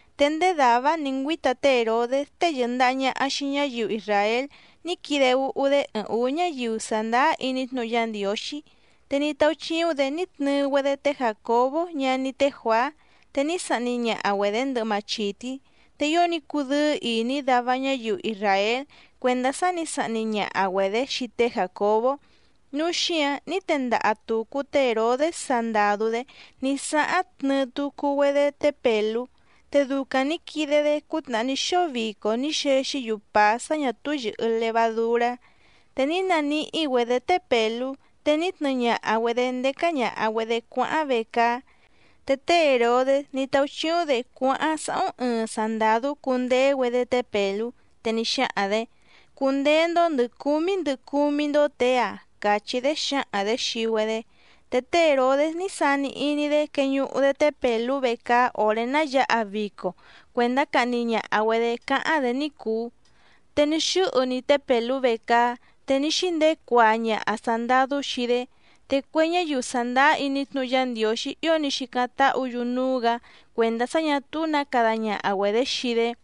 Te ndéé dàvá‑áⁿ nǐ ngüíta té Hèrodés tée yɨ̀ndaha ñaha xii ñáyiu isràél ní quide úhú‑dé ɨɨⁿ ǔú ñáyiu sàndáá iní tnúhu Yá Ndiǒxí. Te ní táúchíúⁿ‑dě ní tnɨɨ‑güedé té Jàcobó ñaní té Juàá, te ní sahni ñaha‑güedě ndɨhɨ machìtí. Te ío ní cudɨ́ɨ́ ìní dava ñáyiu isràél cuèndá sá nǐ sahni ñaha‑güedě xii té Jàcobó, núu xíǎⁿ ní tendaha tùcu té Hèrodés sandàdú‑dé ní sáháⁿ tnɨɨ tucu‑güedé té Pèlú. Te ducaⁿ nǐ quide‑dé cútnàhá ní xóo vico ní xexí‑yu pàá sá ñà túú yɨ̀hɨ levadurá. Te ní naníhí‑güedě té Pèlú, te ní tnɨɨ ñaha‑güedě ndécá ñàha‑güedé cuáháⁿ vecaá. Te té Hèrodés ní táúchíúⁿ‑dě cuáháⁿ sáhúⁿ ɨɨⁿ sandàdú cùndeé‑güedé té Pèlú. Te ní xáhaⁿ‑dě: —Cundeé‑ndó ndɨ̀ cúmí ndɨ cúmí‑ndó těe‑ǎⁿ —càchí‑dé xǎhaⁿ‑dě xii‑güedé. Te té Hèrodés ní sani iní‑dé queñuhu‑dé té Pèlú vecaá òré ná yǎha vico cuèndá cahni ñaha‑güedě cáháⁿ‑dě ní cùu. Te ní xɨ́hɨ‑ni té Pèlú vecaá, te ní xíndeé cuaa ñaha sàndadú xii‑dé. Te cue ñáyiu sàndáá iní tnúhu Yá Ndiǒxí ío ní xícáⁿ táhǔ‑yu núú‑gǎ cuèndá sá ñà túú nǎ cada ñaha‑güedě xii‑dé.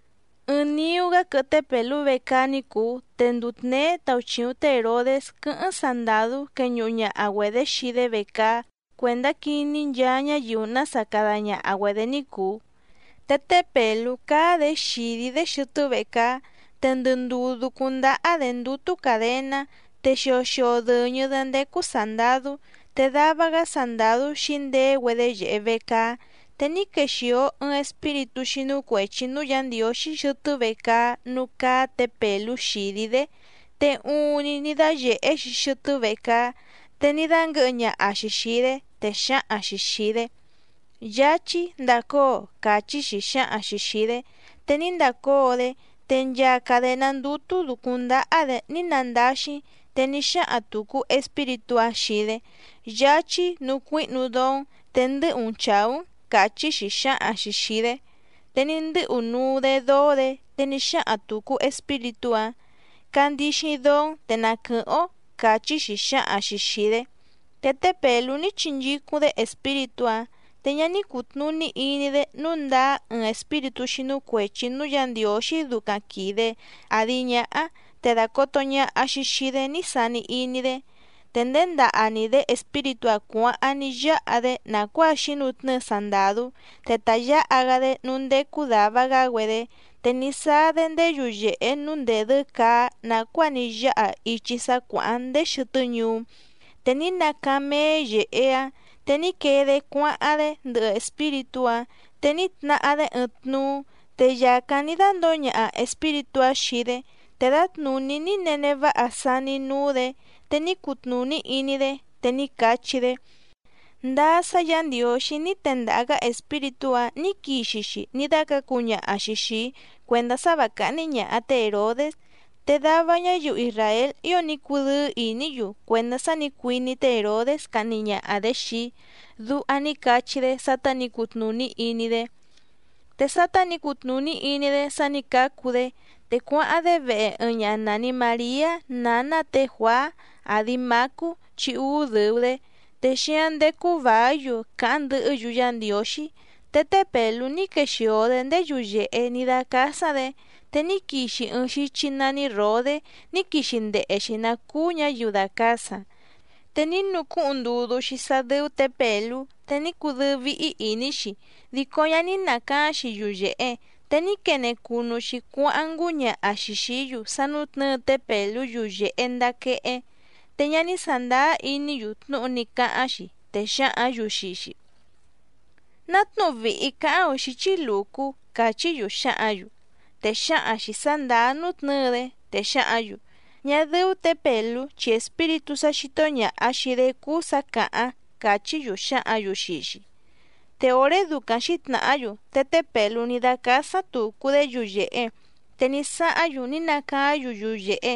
Ɨɨⁿ niú‑gá quɨhɨ té Pèlú vecaá ní cùu, te nduu tněé tauchìuⁿ té Hèrodés quɨ́hɨ́ⁿ sandàdú queñuhu ñaha‑güedě xii‑dé vecaá cuèndá quiní nchaa ñáyiu nása cada ñaha‑güedě ní cùu. Te té Pèlú cáá‑dě xìdí‑dé xɨtɨ́ vecaá, te ndɨ ndùú dúcúⁿ ndáhá‑dě ndútú càdená, te xio xio dɨ̀ñɨ‑dé ndécú sàndadú, te dava‑gá sandàdú xǐndeé‑güedé yèhe vecaá. Te ní quexìo ɨɨⁿ espíritú xínú cuèchi núú Yǎ Ndiǒxí xɨtɨ́ vecaá núú cáá tě Pèlú xìdí‑dé, te uuⁿni ní dáyèhé‑xi xɨtɨ́ vecaá, te ní dánguɨ̌hɨ ñaha‑xi xìi‑dé, te xǎhaⁿ‑xi xìi‑dé: —Yáchí, ndàcóo —càchí‑xi xǎhaⁿ‑xi xìi‑dé. Te ní ndacóo‑dé, te nchaa cadèná ndútú dǔcúⁿ ndáhá‑dě ní nandáxí. Te ní xáhaⁿ tùcu espíritú‑áⁿ xii‑dé: —Yáchí, nucuíhnu dóó‑n, te ndɨ́hu‑n chàú‑n —càchí‑xi xǎhaⁿ‑xi xìi‑dé. Te ní ndɨ́hu nuu‑dé dóó‑dě, te ní xáhaⁿ tùcu espíritú‑áⁿ: —Candixi dóó‑n, te na quɨ̀hɨ́ⁿ‑ó —càchí‑xi xǎhaⁿ‑xi xìi‑dé. Te té Pèlú ní chinchícúⁿ‑dé espíritú‑áⁿ, te ñá ní cùtnuní iní‑dé nǔu ndáá ɨɨⁿ espíritú xínú cuèchi núú Yǎ Ndiǒxí ducaⁿ quìde àdi ñáhá, te dàcoto ñaha‑xi xii‑dé ní sani iní‑dé. Te nděndaha‑ni‑dě espíritú‑áⁿ cuǎháⁿ ní yáha‑dé nàcuáa xǐnutnɨ́ɨ sandàdú, te ta yǎha‑gá‑dé núú ndécú dàva‑gá‑güedé. Te ní sáá‑dé ndéé yuyèhe núú ndèdɨ́ caá nàcuáa ní yáha ichi sá cuàháⁿ ndéé xɨtɨ́ ñuú, te ní nacaáⁿ méé yèhe‑áⁿ, te ní quee‑dé cuáháⁿ‑dé ndɨhɨ espíritú‑áⁿ. Te ní tnahá‑dé ɨɨⁿ tnuú, te yàcáⁿ ní dándǒo ñaha espíritú‑áⁿ xii‑dé. Te dǎtnùní ní nene váha saní núú‑dě, te ní cutnùní iní‑dé, te ní cachí‑dé: —Ndáá sá Yǎ Ndiǒxí ní tendaha‑gǎ espíritú‑ǎⁿ ní quixi‑xi ní dácǎcu ñaha‑xi xìi‑í cuèndá sá và cáhní ñàha té Hèrodés. Te dava ñáyiu isràél ío ní cudɨ́ɨ́ ìní‑yu cuèndá sá nǐ cuiní té Hèrodés cahni ñaha‑dě xii‑í —duha ní cachí‑dé sátá nǐ cutnùní iní‑dé. Te sátá nǐ cutnùní iní‑dé sá nǐ cácu‑dé, te cuáháⁿ‑dé vehe ɨɨⁿ ñaha nàni Mariá nǎná tě Juàá, àdi Mácú chi úú dɨ̀u‑dé, te xíáⁿ ndécú vàí‑yu càháⁿ ndɨhɨ́‑yu Yá Ndiǒxí. Te té Pèlú ní quexìo‑dé ndéé yuyèhe ní dácásáⁿ‑dě, te ní quixi ɨɨⁿ xíchí nání Ròdé ní quixi ndehe‑xi nǎ cúú ñǎyiu dàcasaⁿ. Te ní nucúhuⁿ ndudú‑xi sá dɨ́ú tě Pèlú, te ní cudɨ́ɨ́ víhí ìní‑xi, dico ñá ní nàcaáⁿ‑xi yuyèhe. Te ní quene cunu‑xi cuáháⁿ ngúñaha‑xi xìí‑yu sá nútnɨ̌ɨ té Pèlú yuyèhe ndaa quehé. Te ñá ní sàndáá iní‑yu tnúhu ní cáháⁿ‑xi, te xǎhǎⁿ‑yu xii‑xi: —¡Ná tnúhu vìhi cáháⁿ‑ǒⁿ xíchí lùcú! —càchí‑yu xǎhǎⁿ‑yu. Te xǎhaⁿ‑xi sǎ ndàá nútnɨ̌ɨ‑dé, te xǎhǎⁿ‑yu: —Ñá dɨ́ú tě Pèlú chi espíritú sá xító ñàha xii‑dé cúú sǎ càháⁿ —càchí‑yu xǎhǎⁿ‑yu xii‑xi. Te òré ducaⁿ xǐtnàhá‑yu, te té Pèlú ní dácásáⁿ tùcu‑dé yuyèhe. Te ní sáháⁿ‑yu ní nacaáⁿ‑yu yuyèhe,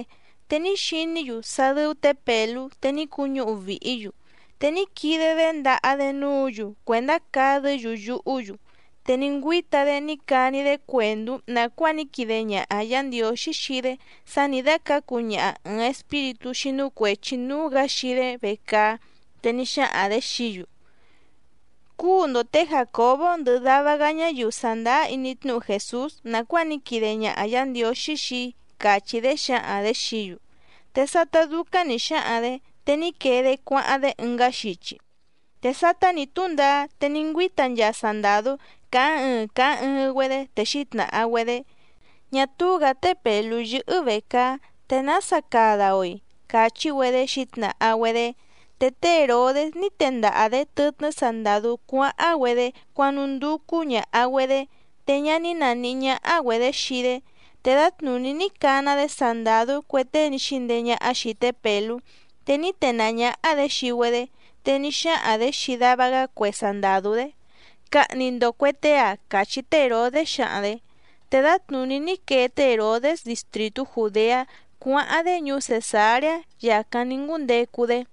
te ní xiní‑yu sá dɨ́ú tě Pèlú, te ní cuñúhu vìhí‑yu. Te ní quide‑dé ndaha‑dé núǔ‑yu cuèndá cadɨ́‑yu yuhú‑yu. Te ní ngüíta‑dé ní cani‑dé cuèndú nàcuáa ní quide ñaha Yǎ Ndiǒxí xii‑dé sá nǐ dácǎcu ñaha ɨ̀ɨⁿ espíritú xínú cuèchi núú‑gǎ xii‑dé vecaá, te ní xáhaⁿ‑dě xií‑yu: —Cúu‑ndo tě Jàcobó ndɨhɨ dava‑gá ñáyiu sàndáá iní tnúhu Jèsús nàcuáa ní quide ñaha Yǎ Ndiǒxí xii‑í —càchí‑dé xǎhaⁿ‑dě xií‑yu. Te sátá dúcáⁿ nǐ xáhaⁿ‑dě, te ní quee‑dé cuáháⁿ‑dé ɨngá xichi. Te sátá nǐ túndaá, te ní ngüíta nchaa sandàdú càháⁿ ɨɨⁿ càháⁿ ɨɨⁿ‑güedé, te xǐtnàha‑güedé: —Ñá túú‑gǎ té Pèlú yɨ́hɨ́ vècaá, ¿te nása cada‑o‑i? —càchí‑güedé xǐtnàha‑güedé. Te té Hèrodés ní tendaha‑dě tɨtnɨ́ sandàdú cuáháⁿ‑güedé cuánúndúcú ñàha‑güedé, te ñá ní nàníhí ñáhá‑güedě xii‑dé. Te dǎtnùní ní cana‑dé sandàdú cue tée ní xíndeé ñáhá xìi té Pèlú, te ní tenàá ñáhá‑dě xii‑güedé, te ní xáhaⁿ‑dě xii dava‑gá cue sandàdú‑dé: —Cahni‑ndo cuè tée‑ǎⁿ —càchí té Hèrodés xǎhaⁿ‑dě. Te dǎtnùní ní quee té Hèrodés distrìtú Jùdeá cuáháⁿ‑dé ñuú Cèsareá, yàcáⁿ ní ngúndecu‑dé.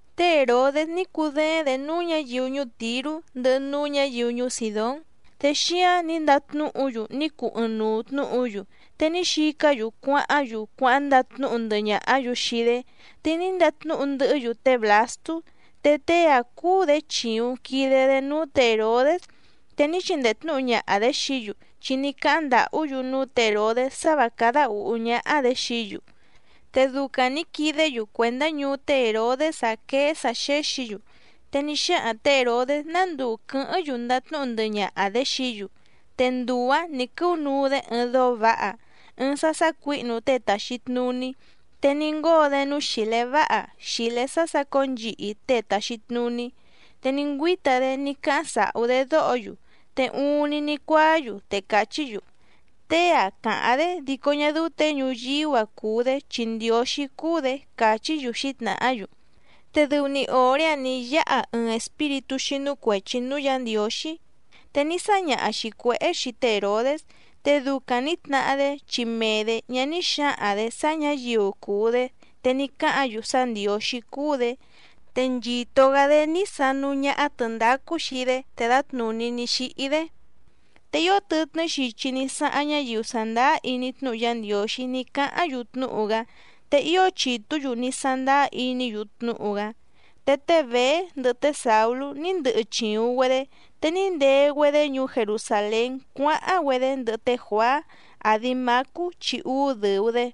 Té Hèrodés ní cudééⁿ‑dě núú ñǎyiu ñuú Tìrú ndɨhɨ núú ñǎyiu ñuú Sìdón. Te xíǎⁿ ní ndatnúhu‑yu ní cuu ɨɨⁿnuu tnǔhu‑yu, te ní xicá‑yu cuáháⁿ‑yu cuáháⁿ ndatnúhu ndɨhɨ ñàhá‑yu xii‑dé, te ní ndatnúhu ndɨhɨ́‑yu té Blàstú. Te tée‑áⁿ cúú‑dě chìuⁿ quide‑dé núú tě Hèrodés, te ní chindee tnǔhu ñaha‑dě xií‑yu, chi ní cáháⁿ ndàhú‑yu núú tě Hèrodés sá vǎ cádá ǔhú ñáhá‑dě xií‑yu. Te ducaⁿ nǐ quidé‑yu cuèndá ñuú té Hèrodés‑áⁿ quéé sǎ xéxǐ‑yu. Te ní xáhaⁿ tě Hèrodés ná nduu quɨ̌hɨ́ⁿ‑yu ndatnúhu ndɨhɨ ñaha‑dě xií‑yu, te nduu‑ǎⁿ nǐ quɨ́unuu‑dé ɨɨⁿ dóó vǎha, ɨɨⁿ sá sácuǐhnu tée tàxi tnuní. Te ní ngóo‑dé núú xìlé váha, xìlé sá sácǒo nchihi tée tàxi tnuní, te ní ngüíta‑dé ní cáháⁿ sàhú‑dé dóho‑yu. Te uuⁿni ní cuáá‑yu te càchí‑yu: —¡Tée‑a càháⁿ‑dé dico ñá dɨ́ú těe ñuyíú‑a cùu‑dé chi ndiǒxí cúú‑dě! —càchí‑yu xǐtnàhá‑yu. Te dɨu‑ni òré‑áⁿ nǐ yáha ɨɨⁿ espíritú xínú cuèchi núú Yǎ Ndiǒxí, te ní sáñaha‑xi cuěhé xii té Hèrodés. Te ducaⁿ nǐ tnahá‑dé chi mee‑dě ñá ní xǎhaⁿ‑dě sá ñǎyiu cùu‑dé, te ní cáhǎⁿ‑yu sá ndiǒxí cúú‑dě. Te nchìto‑gá‑dé ní sanú ñáhá tɨ̀ndácú xii‑dé, te dǎtnùní ní xíhí‑dé. Te ío tɨtnɨ́ xichi ní sáháⁿ ñáyiu sàndáá iní tnúhu Yá Ndiǒxí ní cáháⁿ‑yu tnúhu‑gá, te ío chìtú‑yu ní sándáá iní‑yu tnúhu‑gá. Te té Bèé ndɨhɨ té Sàulú ní ndɨhɨ chìuⁿ‑güedé, te ní ndee‑güedé ñuú Jerusàlén cuáháⁿ‑güedé ndɨhɨ té Juàá, àdi Mácú chi úú dɨ̀u‑dé.